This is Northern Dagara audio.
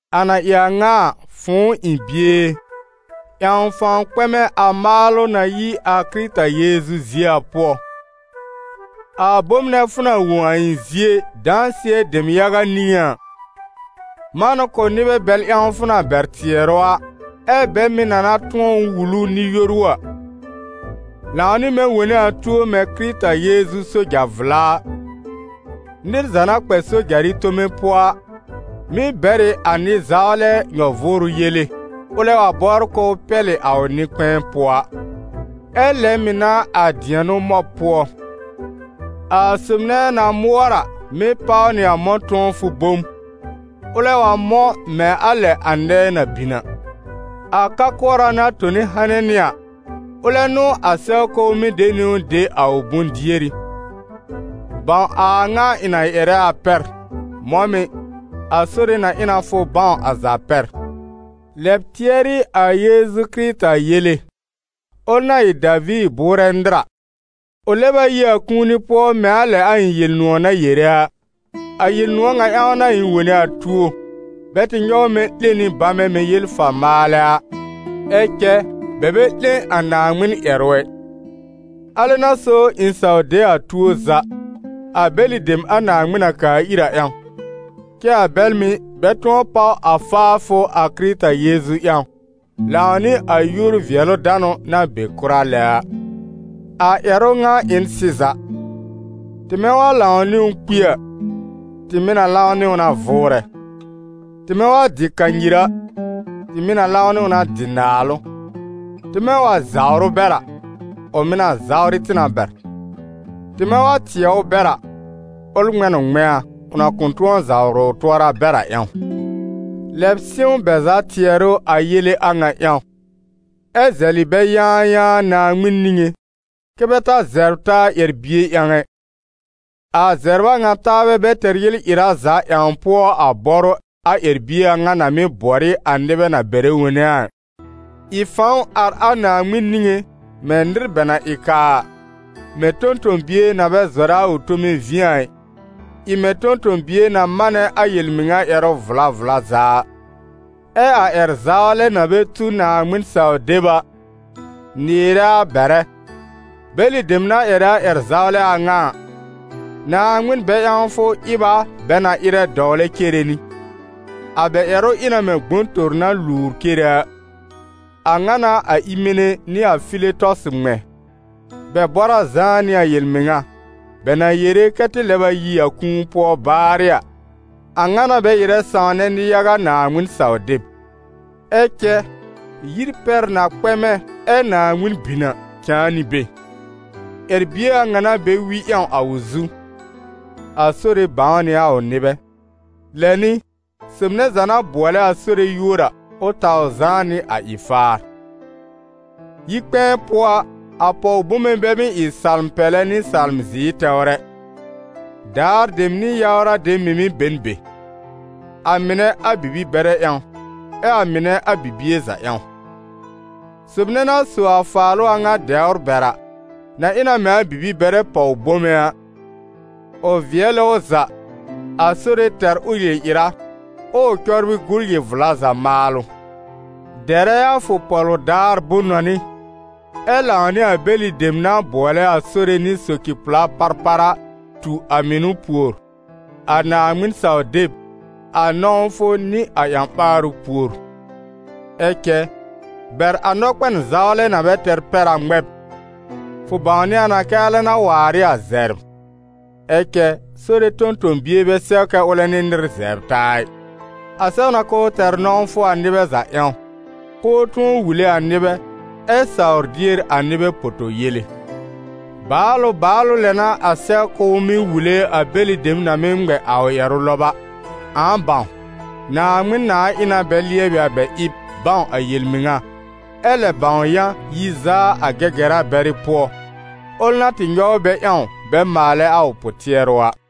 A na ɩ a ŋa a, fʋ̃ʋ ɩ̃ bie e, ƴãw fãw kpɛmɛ a maalʋ na yi a Kɩrɩta Yeezu zie a pʋɔ. A bom nɛ fʋ na wõ a ɩ̃ zie, dãsɩɛ dem yaga niŋé a, man ʋ kʋ̀ nɩbɛ bɛl ƴãw fʋ na bɛr tɩɛrʋ a, ɛ́ bɛ mɩ̀ na na tʋ̃ɔ wul ʋ nɩ-yoru a. Lãw nɩ mɛ̃ wone a tuo mɛ̃ Kɩrɩta Yeezu soja-vla a. Nɩr za na kpɛ sojarɩ tome pʋɔ a, mɩ́ bɛr ɩ a nɩ-zawlɛ nyɔ-vʋʋrʋ yele, ʋlɛ wa bɔbr k'ʋʋ pɛlɩ a ʋ nɩ-kpɛ̃ɛ pʋɔ a. Ɛ lɛ mɩ̀ n'a a dɩɛnʋ mɔb pʋɔ. A sob nɛ na mʋɔr a, mɩ́ páw nɩ a mɔ̃-tʋ̃ɔfʋ bom, ʋlɛ wa mɔ̃ mɛ̃ a lɛ a nɛɛ na bin a. A ka-kʋɔra na tõ hanɩ nɩ a, ʋlɛ n'ʋ a sɛw k'ʋʋ mɩ́ de niwn de a ʋ bʋ̃-dieri. Bãw a a ŋa ɩ̃ na ƴɛrɛ a pɛr. Mɔ̃ mɩ̀, a Sore na ɩ na fʋ bãw a za pɛr. Lɛb tɩɛrɩ a Yeezu Kɩrɩta yele, ʋl na ɩ Daviir bʋʋrɛ nɩr a: ʋ lɛb a yi a kũuni pʋɔ mɛ̃ a lɛ a ɩ̃ Yel-nʋ̃ɔ̀ na yere a. A Yel-nʋ̃ɔ̀ ŋa ƴãw n'a ɩ̃ wone a tuo, bɛ tɩ nyɔw mɛ̃ 'lẽ nɩ bamɛ mɛ̃ yel-fa-maalɛ a. Ɛ cɛ bɛ bɛ 'lẽ a Naaŋmɩn ƴɛrʋ ɛ! Alɛ n'a so ɩ̃ saw de a tuo za, a bɛlɩ dem a Naaŋmɩn na kaa ir a ƴãw, kɛ́ a bɛl mɩ̀, bɛ tʋ̃ɔ páw a faafʋ a Kɩrɩta Yeezu ƴãw, lãw nɩ a yúor-vɩɛlʋ-danʋ na be kʋra lɛ a. A ƴɛrʋ ŋa ɩ n sɩza: «Tɩmɛ wa lãw nɩ ʋ kpi a, tɩ mɩ̀ na lãw nɩ ʋ na vʋʋrɛ; tɩmɛ wa dɩ kanyir a, tɩ mɩ̀ na lãw nɩ ʋ na dɩ naalʋ; tɩmɛ wa zawr ʋ bɛr a, ʋ mɩ̀ na zawrɩ tɩ na bɛr; tɩmɛ wa tɩɛ ʋ bɛr a, ʋl ŋmɛ̃ n ʋ ŋmɛ̃a, ʋ na kʋ̃ tʋ̃ɔ zawrɩ ʋ tʋɔra bɛr a ƴãw.» Lɛb sɩ̃w bɛ za tɩɛrʋ a yele a ŋa ƴãw, ɛ́ zɛlɩ bɛ yãayãa Naaŋmɩn niŋé, kɛ́ bɛ ta zɛbr taa ƴɛr-bie ƴãw ɛ, a zɛbr a ŋa taabɛ bɛ tɛr yel-ɩra za ƴãw pʋɔ a bɔrʋ a ƴɛr-bie a ŋa na mɩ́ bɔr ɩ a nɩbɛ na bɛrɛ wone a ɩ. Ɩ fãw ar a Naaŋmɩn niŋé mɛ̃ nɩr bɛ na ɩ kaa a, mɛ̃ tõ-tõ-bie na bɛ zɔrɛ a ʋ tome vĩ a ɩ, ɩ mɛ̃ tõ-tõ-bie na manɛ a yel-mɩŋa ƴɛrʋ vla vla za a. Ɛ a ƴɛr-zawlɛ na bɛ tu Naaŋmɩn-saw-deb a, nɩɩrɛ a bɛrɛ. Bɛlɩ dem na ƴɛrɛ a ƴɛr-zawlɛ a ŋa a, Naaŋmɩn-bɛ-ƴãwfʋ ɩb a bɛ na ɩrɛ dɔwlɛ cere nɩ. A bɛ ƴɛrʋ ɩ na mɛ̃ gbõtor na luwr cere a. A ŋa n'a a Ɩmene nɩ a Filetɔsɩ ŋmɛ̃. Bɛ bɔr a zãá nɩ a yel-mɩŋa, bɛ na yere kɛ tɩ lɛb a yi a kũu pʋɔ baarɩ a, a ŋa n'a bɛ ɩrɛ sãwnɛ nɩ-yaga Naaŋmɩn-saw-deb. Ɛ cɛ yir pɛr na kpɛmɛ ɛ Naaŋmɩn bin a, cãa nɩ be. Ƴɛr-bie a ŋa n'a bɛ wi ƴãw a ʋ zu: «A Sore bãw nɩ a ʋ nɩbɛ», lɛ nɩ: «Sob nɛ za na bʋɔlɛ a Sore yúor a, ʋ taw zãá nɩ a ɩ-faar.» Yi-kpɛ̃ɛ pʋɔ a, a pɔw-bome bɛ mɩ́ ɩ salm-pɛlɛ nɩ salm-zɩɩr tɛwr ɛ, daar dem nɩ yawra dem mɩ̀ mɩ́ be n be. A mɩnɛ a bibi-bɛrɛ ƴãw, ɛ a mɩnɛ a bibie za ƴãw. Sob nɛ na sò a faalʋ a ŋa dɛwr bɛr a, na ɩ na mɛ̃ a bibi-bɛrɛ pɔw-bome a, ʋ vɩɛlɩ ʋ za, a Sore tɛr ʋ yel-ɩra, ɛ́ ʋ cɔbrɩ gu yel-vla za maalʋ. Dɛrɛ a fʋ pɔ̀lʋ daar bʋ̃-nɔnɩ; ɛ lãw nɩ a bɛlɩ dem na bʋɔlɛ a Sore nɩ soci-pla parpar a, tu a mɩnʋ pùor, a Naaŋmɩn-saw-deb, a nɔ̃wfʋ nɩ a ƴã-ɓaarʋ pùor. Ɛ cɛ, bɛr a nɔkpɛn zawlɛ na bɛ tɛr pɛr a ŋmɛb. Fʋ bãwnɩ a na kɛ́ alɛ n'a waar ɩ a zɛbr. Ɛ cɛ Sore tõ-tõ-bie bɛ sɛw kɛ ʋlɛ nɩ nɩr zɛbr taa ɩ. A sɛw na k'ʋʋ tɛr nɔ̃wfʋ a nɩbɛ za ƴãw, k'ʋʋ tʋ̃ɔ wule a nɩbɛ, ɛ sawr dier a nɩbɛ poto-yele. Baalʋ baalʋ lɛ n'a a sɛw k'ʋʋ mɩ́ wule a bɛlɩ dem na mɩ́ ŋmɛ a ʋ ƴɛrʋ lɔb a. Ãa bãw, Naaŋmɩn nãà ɩ na bɛ lɩɛbɩ a bɛ ɩb, bãw a yel-mɩŋa, ɛ lɛb bãw yã yi zaa a Gɛgɛra bɛrɩ pʋɔ, ʋl na tɩ nyɔw bɛ ƴãw bɛ maalɛ a ʋ pʋ-tɩɛrʋ a.